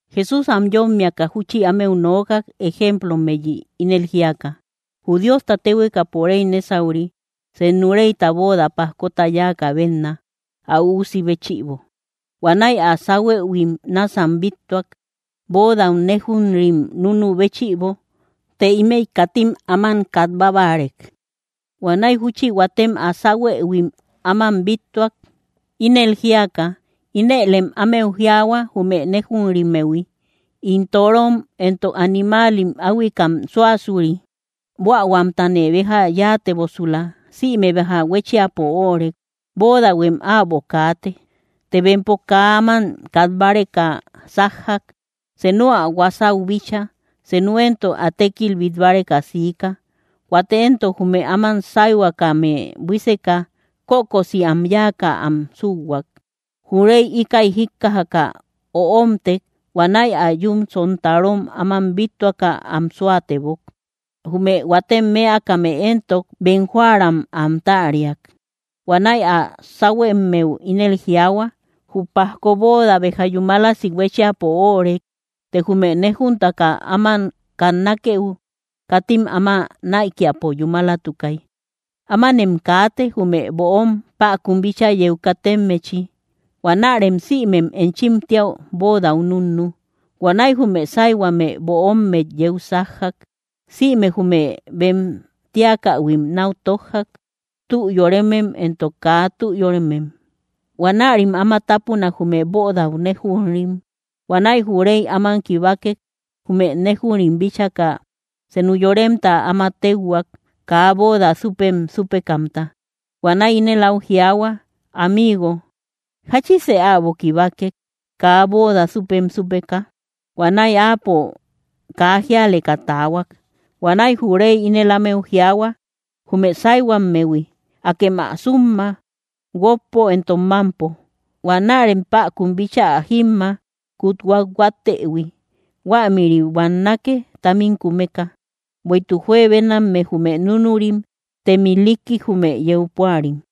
Jesús am yómmiaka júchi ámeu nookak, ejemplommeyi, ínel jíaka: —Jü Diosta téhuekapo réy nésauri, senu réyta bóoda pajkota yáakä bénna, ä üusi béchïbo. Huanäi ä sáhuëhuim náasam bíttuak, bóodau néjunrim núnu béchïbo; të ímëi katim áman kat bábarek. Huanäi júchi huatem ä sáhuëhuim áman bíttuak, ínel jíaka: inëlem ámeu jiaahua, jume néjunrimmehui: “In toorom entok animaalim äahuikam súasuri; buähuamtane béja yáatebosula. Sïme béja huéchiapo óorek. Bóodahuem äbo kaate.” Të bempo kaa áman kat báreka sájjak, senu ä huasau bíchaa, senu éntok ä tékil bít báreka siika. Huate éntok, jume áman sáyhuakame buíseka, kökosi am yáaka am súuhuak. Jü réy íkäi jíkkajaka öomtek. Huanäi ä yún sontarom áman bíttuaka am súatebok, jume huatem mëakame entok bem jóära am táariak. Huanäi ä sáhuemmeu ínel jiaahua: “Jü pajko bóoda béja yúmalasi huéchiapo óorek; të jume néjuntaka áman kannakeu katim áma näikiapo yúmalatukay. Ámanem kaate, jume böom päkun bíchaa yeu katemmechi. Huanärem sïmem enchim tíäu bóodau núnnu.” Huanäi jume sáyhuame böommet yeu sájjak. Sïmem jume bem tíakähuim náu tójjak, tü yóremem entok kaa tü yóremem. Huanärim áma tápunak, jume bóodau néjunrim. ’Huanäi jü réy áman kibakek, jume néjunrim bíchaka senu yoremta áma téuhuak, kaa bóoda súpem súpekamta. Huanäi ínel áu jiaahua: “Amigo, ¿jáchise äbo kibakek, kaa bóoda súpem súpeka?” Huanäi áapo kaa jíaleka taahuak. Huanäi jü réy ínel ámeu jiaahua, jume sáyhuammehui: “¡Akem ä súmma, guókpo entok mámpo! Huanärem päkun bíchaa ä jímma, kut huathuattëhui. Huämïri buannake, támim kumeka.” Bueïtuk juebenamme jume núnurim; tem ilikki jume yeu púari.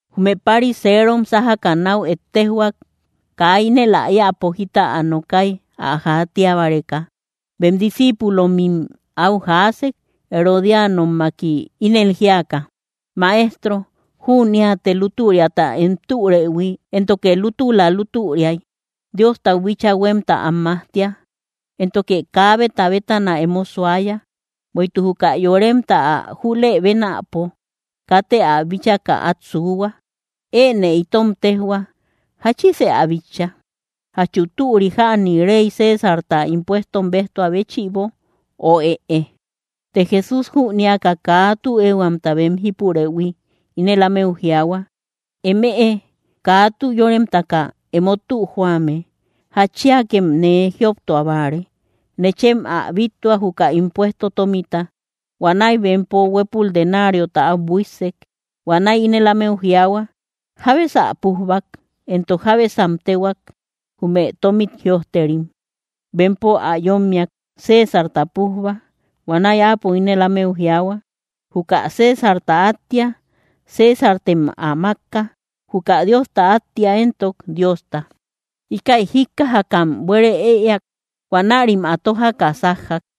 Jume pariserom sájaka náu ettejhuak, kaa ínel ä éäpo jita ä nokay ä jaatia báreka. Bem discíipulomim áu jaasek, herodianommaki, ínel jíaka: —Maestro, jüneate lútüriata em türëhui, éntoke lútula lútüriay Diostau bíchaa huémta am majtia; éntoke kaabeta bétana emo suaya, bueïtuk juka yoremta, ä júlëbénapo, katë ä bíchaka át suuhua. Enë itom téjhua: ¿Jáchisë ä bitcha? ¿Jachu türi jäni rey Césarta impuestom béjtua béchïbo? Ö, ¿ëe? Të Jesús jünéaka kaa tü éehuamta bem jípurëhui, ínel ámeu jiaahua: —Emëe kaa tü yórememtaka emo tü joame. ¿Jatchiakem nee jioptua báare? Nechem ä bíttua, juka impuesto tómita. Huanäi bempo huépul denariota áu buíssek. Huanäi ínel ámeu jiaahua: —¿Jábesa pújbak, entok jábesam téhuak, jume tómit jïojterim? Bempom ä yómmiak: —Césarta pújba. Huanäi Áapo ínel ámeu jiaahua: —Juka Césarta áttia, Césartem ä mákka; juka Diosta áttia éntok, Diosta. Íkäi jíkkajakam buére ëeak. Huanärim ä tójaka sájjak.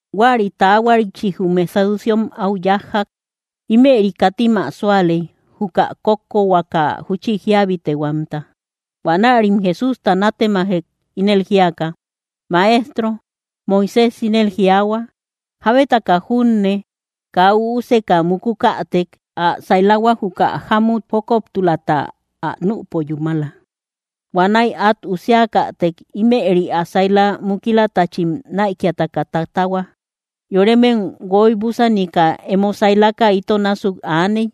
Huäri taahuarichi jume saduceom áu yájjak. Ímëri katim ä súaley, juka kókkohuaka júchi jíabitehuamta. Huanärim Jesústa nátemajek, ínel jíaka: —Maestro, Moisés ínel jiaahua, jábetaka junne kaa üuseka mukukätek, ä sailahua juka jámut jókoptulata ä nüpo yúmala. Huanäi át usiakätek, ímëri ä saila mukilatachim näikiataka tatahua. Yoremem guoy‑búsanika, emo sailaka ito násuk aaney.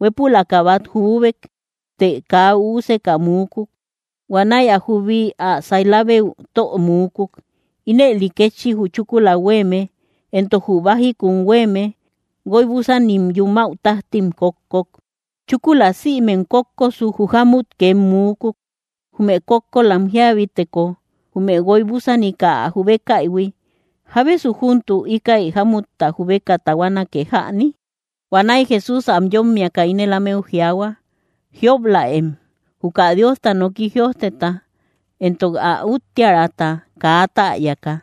Huépülaka bát juubek, të kaa üuseka muukuk. Huanäi ä jubi ä sailabeu tö muukuk. Ínëli kétchi jü chúkula huéeme entok jü bájikun huéeme, guoy‑búsanim yumäu tájtim kókkok. Chúkula sïmem kókkosuk, jü jámut két muukuk. Jume kókkolam jíabiteko, jume guoy‑búsanika ä jubekaïhui, ¿jábesu júntuk íkäi jámutta jubeka tahuanake jäni? Huanäi Jesús am yómmiaka ínel ámeu jiaahua: —Jiop‑läem, juka Diosta noki jïojteta entok ä úttiära kaa täyaka.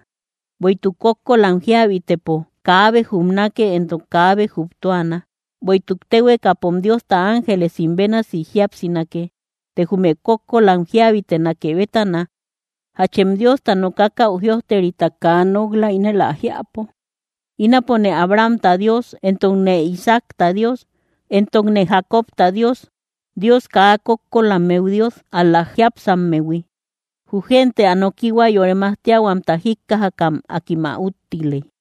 Bueïtuk kókkolam jíabitëpo, kaabe jubnake entok kaabe jubtuana; bueïtuk téhuekapom Diosta ángelesim bénasi jíapsinake. Të jume kókkolam jíabitenake bétana, ¿jachem Diosta nokakäu jïojterita kaa nok‑la, ínel ä jiäpo?: “Ínapone Abrahamta Dios, entokne Isaacta Dios, entokne Jacobta Dios.” Dios kaa kókkolammeu Dios, ál‑la jiápsammehui. Jü gente ä nokihua yore majtiahuamta jíkkajakam akim ä úttiley.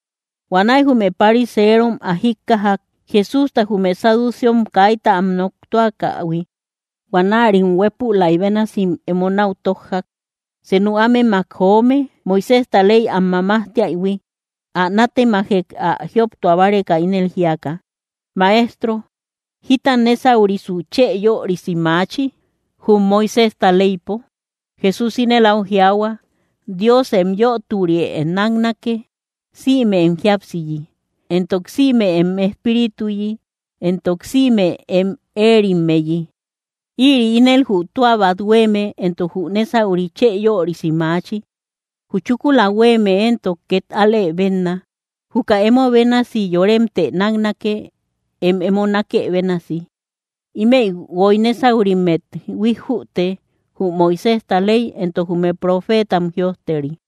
Huanäi jume pariserom ä jíkkajak, Jesústa jume saduceom kaita am noktuakähui. Huanärim huépülay bénasim emo náu tójjak. Senu ámemak joome, Moiséjta ley am mamajtiaïhui, ä nátemajek ä jioptua báreka, ínel jíaka: —Maestro, ¿jita nésaurisu chë yörisi maachi, jum Moiséjta leypo? Jesús ínel áu jiaahua: —“Dios em yöturië náknake, sïme em jíapsiyi, entok sïme em espírituyi, entok sïme em éerimmeyi.” Ïri ínel jü tua bát huéeme entok jü nésauri chë yörisi maachi. Jü chúkula huéeme éntok két alë bénna: “Juka emo bénasi yoremtë náknake, em emo nákë bénasi.” Ímëi guoy nésaurimmet huíjjüte, jü Moiséjta ley entok jume profeetam jïojteri.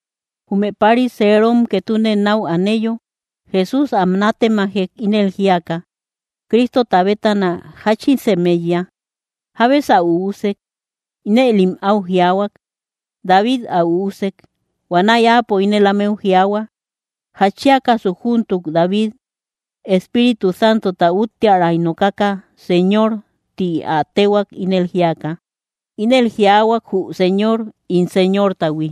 Jume pariserom ketune náu aneyo, Jesús am nátemajek ínel jíaka: —Cristota bétana, ¿jáchisem éiya? ¿Jábesä üusek? Inëlim áu jiaahuak: —David ä üusek. Huanäi Áapo ínel ámeu jiaahua: —¿Jatchiakasu júntuk David, Espíritu Santota úttiäray nokaka, “Señor”? Ti ä téhuak, ínel jíaka: Ínel jiaahuak jü Señor ín Señortahui: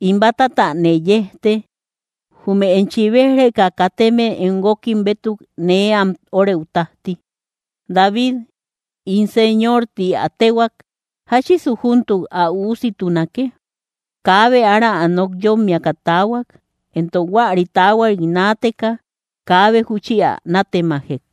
“In bátatanë yejte, jume enchi béj‑reka kateme em guókim bétuk nee am órëu tájti.” David “ín Señor” ti ä téhuak. ¿Jáchisu júntuk ä üussitunake? Kaabe ára ä nok yómmiaka taahuak; entok huäri taahuarit naateka kaabe júchi ä nátemajek.